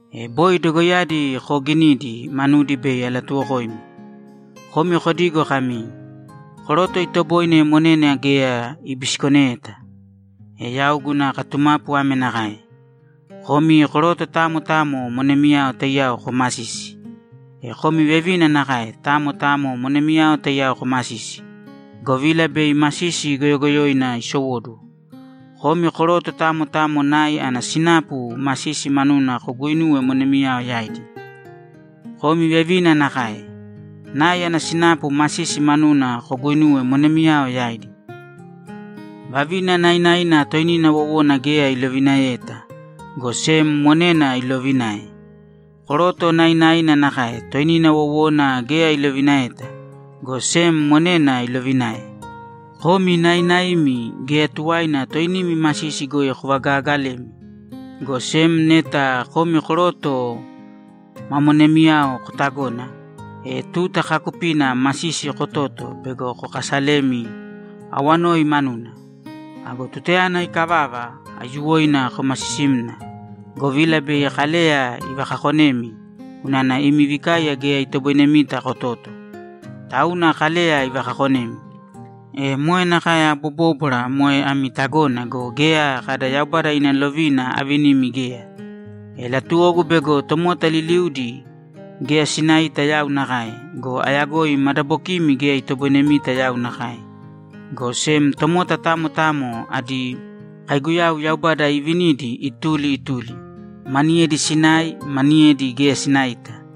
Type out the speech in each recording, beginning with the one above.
E boi dogoiyadi kooginidi, manudi bei alatuwokoimi. Komi kodigo kami, ‘Koroto itoboine monena geya ibisikoneyeta.’ E yau guna katumapu ame nakae: Komi koroto tamo tamo monemiyao taiyao komasīsi. E komi vevina nakae, tamo tamo monemiyao taiyao komasīsi, govila bei masisi goyogoyoina isowóduwo. Komi koroto tamo tamo nai ana sinapu masisi manuna koguinūwe monemiyao yaidi. Komi vevina nakae. Nai ana sinapu masisi manuna koguinūwe monemiyao yaidi. Vavina nainaina toinina wowona geya ilovinaeyeta, go sem monena iloovinae. Koroto nainaina nakae, toinina wowona geya ilovinaeyeta, go sem monena ilovinae. Komi nainaimi, geya tuwaina toinimi masisi goi kovagagalēmi, go sem neta komi koroto ma monemiyao kotagona, e tuta kaakupina masisi kototo bego kokasalemi awanoi manuna. Ago tutayana ikavava, aiyuwoina komasisīmna, govila bei Kaleya ivakakonemi unana imi vikaiya geya itoboinemita kototo, tauna Kaleya ivakakonemi. E moe nakae abobóbwara moe ami tagona go, geya kada Yaubada ina lovina avinimi geya. E latuwogu bego tomota liliudi geya sinaita yau nakae go, ayagoi madabokimi geya itoboinemita yau nakae, go sem tomota tamo tamo adi kaiguyau Yaubada iivinidi ituli ituli, maniyedi sinai, maniyedi geya sinaita.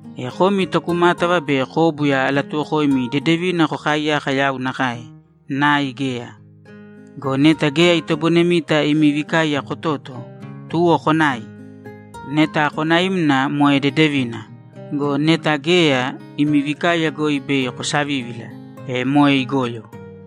E komi tokumátava be kóbuya alatuwokoimi dedevina kokaaiyaka yau nakae, nai geya. Go neta geya itoboinemita imi vikaiya kototo, tuwo konāi. Neta konaimna, moe dedevina go, neta geya, imi vikaiya goi bei kosavívila, e moe igoyo.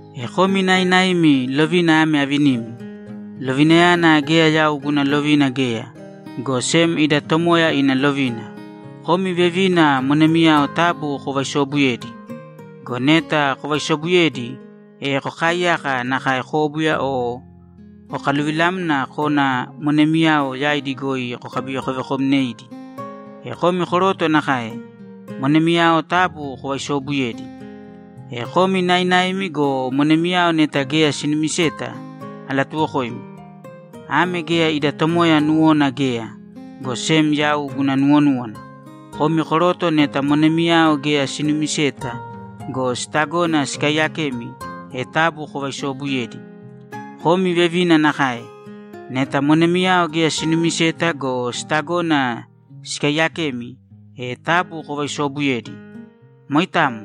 E komi nainaimi, lovina ame avinimi. Lovinayana geya yau guna lovina geya, go sem ida Tomoya ina lovina. Komi vevina, monemiyao taabu kovaisoobuyēdi. Go neta kovaisobuyedi, e kokaiyāka nakae kóbuya o kokaluvilāmna kōna monemiyao yaidi goi kokabivekovekomnēidi. E komi koroto nakae. Monemiyao taabu kovaisoobuyēdi. E komi nainaimi go, monemiyao neta geya sinumiseta, alatuwokoimi. Ame geya ida Tomoya nuwona geya, go sem yau guna nuwonúwana. Komi koroto neta monemiyao geya sinumiseta go, sitagona sikaiyakemi, e taabu kovaisoobuyēdi. Komi vevina nakae. Neta monemiyao geya sinumiseta go, sitagona sikaiyakemi, e taabu kovaisoobuyēdi. Moitamo.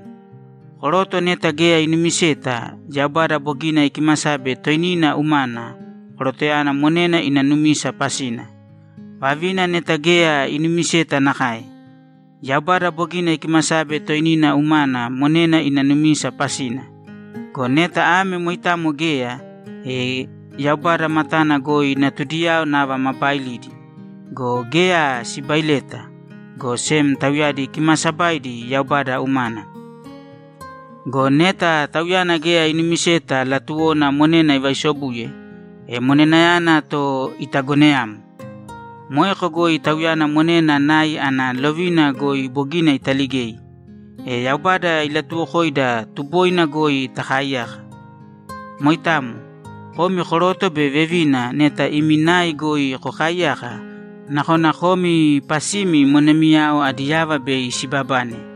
Koroto neta geya inumiseta, Yaubada bogina ikimasabe toinina umana korotoyana monena ina numisa pasina. Vavina neta geya inumiseta nakae. Yaubada bogina ikimasabe toinina umana monena ina numisa pasina. Go neta ame moitamo geya, e Yaubada matana goi natudiyao nava ma baailidi. Go geya sibaileta, go sem tauyadi kimaasabaidi Yaubada umana. Go neta tauyana geya inumiseta latuwona monena ivaisobuye, e monenayana to itagoneyāmo. Moeko goi tauyana monena nai ana lovina goi bogina italigei. E Yaubada ilatuwokoida tuboina goi takaiyāka. Moitamo. Komi koroto be vevina, neta imi nai goi kokaaiyaka, nakona komi pasimi monemiyao adi yava bei sibabane.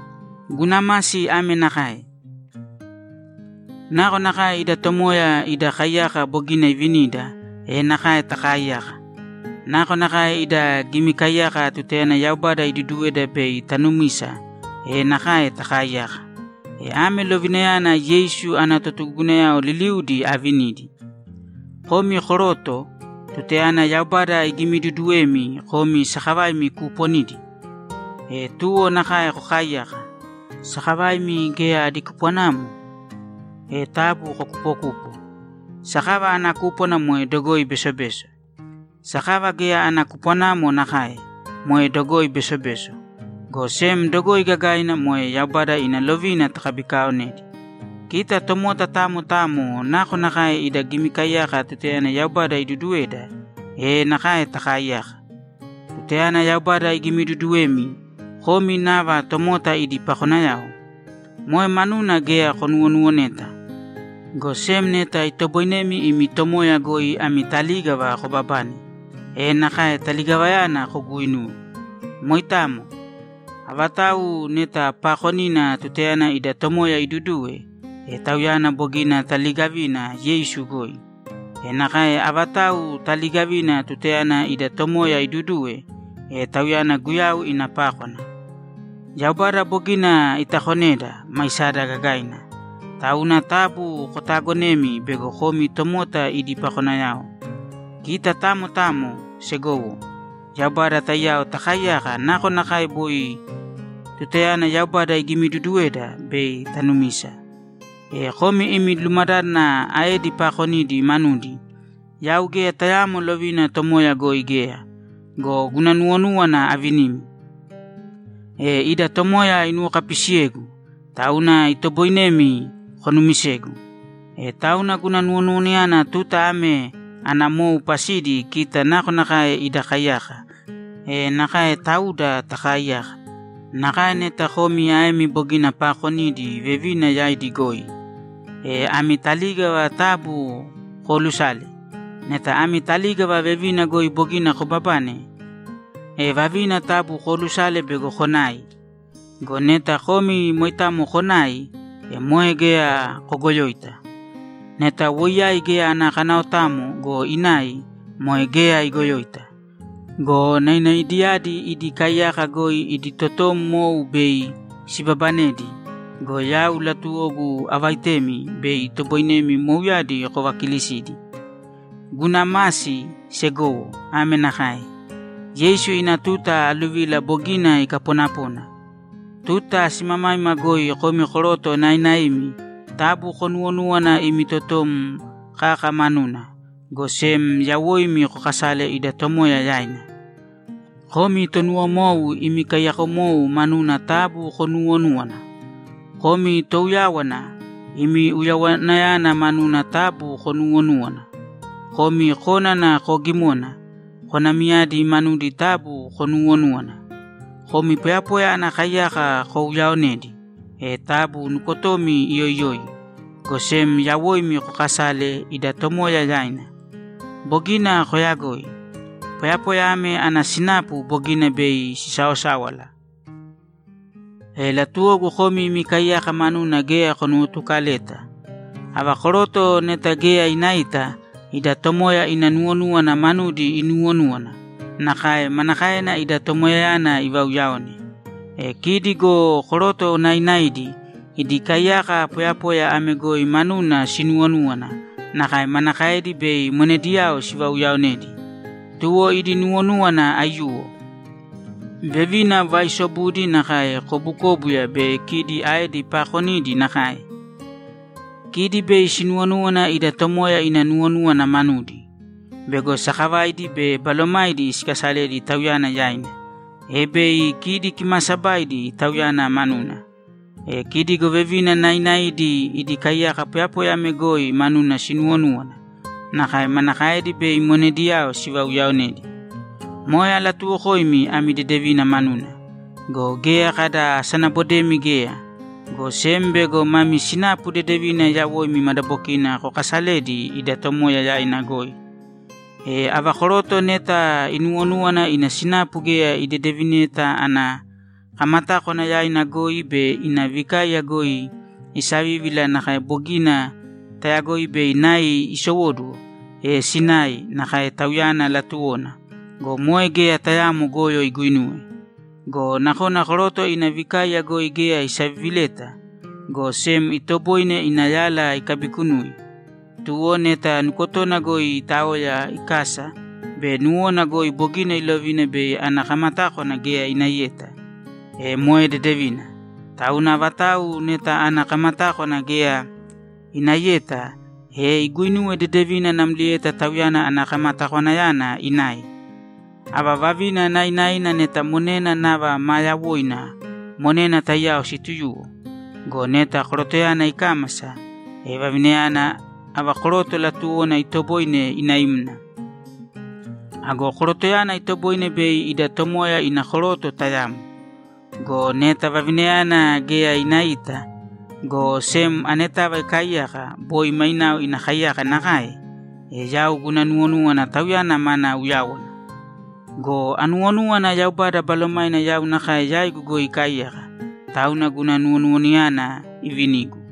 Guna masi ame nakae: Nakonakae ida Tomoya ida kaiyaka bogina ivinida, e nakae takaaiyāka. Nakonakae ida gimikaiyaka tutayana Yaubada iduduweda bei tanumisa, e nakae takaaiyāka. E ame lovinayana Yeisu ana totugugunayao liliudi aavinidi. Komi koroto, tutayana Yaubada igimiduduwemi, komi sakavaimi kuuponidi? E tuwo nakae kokaaiyāka. Sakavaimi geya adi kupwanamo? E taabu kokupokūpo. Sakava ana kúpwana moe dogoi besobeso. Sakava geya ana kupwanamo nakae, moe dogoi besobeso, go sem dogoi gagaina moe Yaubada ina lovina takabikaonedi. Kita tomota tamo tamo nakonakae ida gimikaiyaka tutayana Yaubada iduduweda, e nakae takaaiyāka. Tutayana Yaubada igimiduduwemi, komi nava tomota idi pakonayao? Moe manuna geya konuwonuwoneta, go sem neta itoboinemi imi tomoya goi ami talígava kobabane, e nakae taligavayana koguuinūwe. Moitamo. Avatau neta paakonina tutayana ida Tomoya iduduwe, e tauyana bogina taliigavina Yeisu goi. E nakae avatau taliigavina tutayana ida Tomoya iduduwe, e tauyana Guyau ina pákwana. Yaubada bogina itakoneda, maisada gagaina. Tauna taabu kotaagonēmi bego komi tomota idi pakonayao. Kita tamo tamo, segowo, Yaubada taiyao takaaiyāka nakonakae boi tutayana Yaubada igimiduduweda bei tanumisa. E komi imi lumadádana aedi paakonidi manudi, yau geya tayaamo lovina Tomoya goi geya. Go guna nuwonúwana avinimi. E ida Tomoya inuwokapisiyegu, tauna itoboinemi konumisegu. E tauna guna nuwonuwanayana tuta ame ana mou pasidi kita nakonakae ida kaiyaka, e nakae tauda takaaiyāka. Nakae neta komi aemi bogina paakonidi vevina yaidi goi, e ami talígava taabu koolusāle. Neta ami talígava vevina goi bogina kobabane, e vavina taabu koolusāle bego konai. Go neta komi moitamo konai, e moe geya kogoyoita. Neta woiyai geya ana kanaotamo go, inai, moe geya igoyoita. Go nainaidiyadi idi kaiyaka goi idi totom mou bei sibabanedi go, yau latuwogu avaitemi bei itoboinemi mouyadi kovakilisidi. Guna masi, segowo, ame nakae: Yeisu ina tuta aluvila bogina ikaponapona. Tuta simamaima goi komi koroto nainaimi taabu konuwonūwana imi totom kaka manuna, go sem yawoimi kokasāle ida Tomoya yaina. Komi tonuwomou, imi kaiyakomou manuna taabu konuuwonūwana. Komi touyáwana, imi uyawanayana manuna taabu konuuwonūwana. Komi kónana koogimona, konamiyadi manudi taabu konuuwonūwana. Komi poyapoya ana kaiyaka kouyaonedi, e taabu nukotomi iyoiyōi, go sem yawoimi kokasāle ida Tomoya yaina. Bogina koyagoi. Poyapoya ame ana sinapu bogina bei sisaosáwala. E latuwogu komi imi kaiyaka manuna geya konuwotukaleta. Ava koroto neta geya inaita, ida Tomoya ina nuwonúwana manudi inuuwonúwana, nakae manakaena ida Tomoyayana ivauyaone. E kidi go koroto nainaidi, idi kaiyaka poyapoya ame goi manuna sinuwonúwana, nakae manakaedi bei monediyao sivauyaonedi. Tuwo idi nuwonúwana aiyuwo. Vevina vaaisobudi nakae kobukóbuya be kidi aedi paakonidi nakae. Kidi bei sinuwonúwana ida Tomoya ina nuwonúwana manudi bego sakavaidi be balomaidi sikasaledi Tauyana yaina, e bei kidi kimaasabaidi Tauyana manuna. E kidi go vevina nainaidi idi kaiyaka poyapoya ame goi manuna sinuwonúwana, nakae manakaedi bei monediyao sivauyaonedi. Moe alatuwokoimi ami dedevina manuna. Go geya kada asanabodemi geya, go sem bego mami sinapu dedevina yawoimi madabokina kokasaledi ida Tomoya yaina goi. E ava koroto neta inuwonúwana ina sinapu geya idedevineta ana kamatákwana yaina goi be ina vikaiya goi isavívila nakae bogina tayagoi bei nai isowóduwo, e sināi nakae tauyana latuwona go, moe geya tayaamo goyo iguinuwe. Go nakona koroto ina vikaiya goi geya isavivileta, go sem itoboine ina yala ikabikunui. Tuwo neta nukotona goi itaoya ikasa be nuwona goi bogina ilovina bei ana kamatákwana geya inaiyeta, e moe dedevina. Tauna avatau neta ana kamatákwana geya inaiyeta, e iguinuwe dedevina namlieta tauyana ana kamatakwanayana inai. Ava vavina nainaina neta monena nava ma yawoina, monena taiyao situyūwo. Go neta korotoyana ikámasa, e vavinayana, ava koroto latuwona, itoboine inaimna. Ago korotoyana itoboine bei ida Tomoya ina koroto tayamo. Go neta vavinayana geya inaita, go sem anetava ikaaiyaka boi mainao ina kaiyaka nakae, e yau guna nuwonúwana tauyana mana uyáwana. Go anuwonúwana Yaubada Balomaina yau nakae yaigu goi ikaaiyaka, tauna guna nuwonuwanayana ivinigu.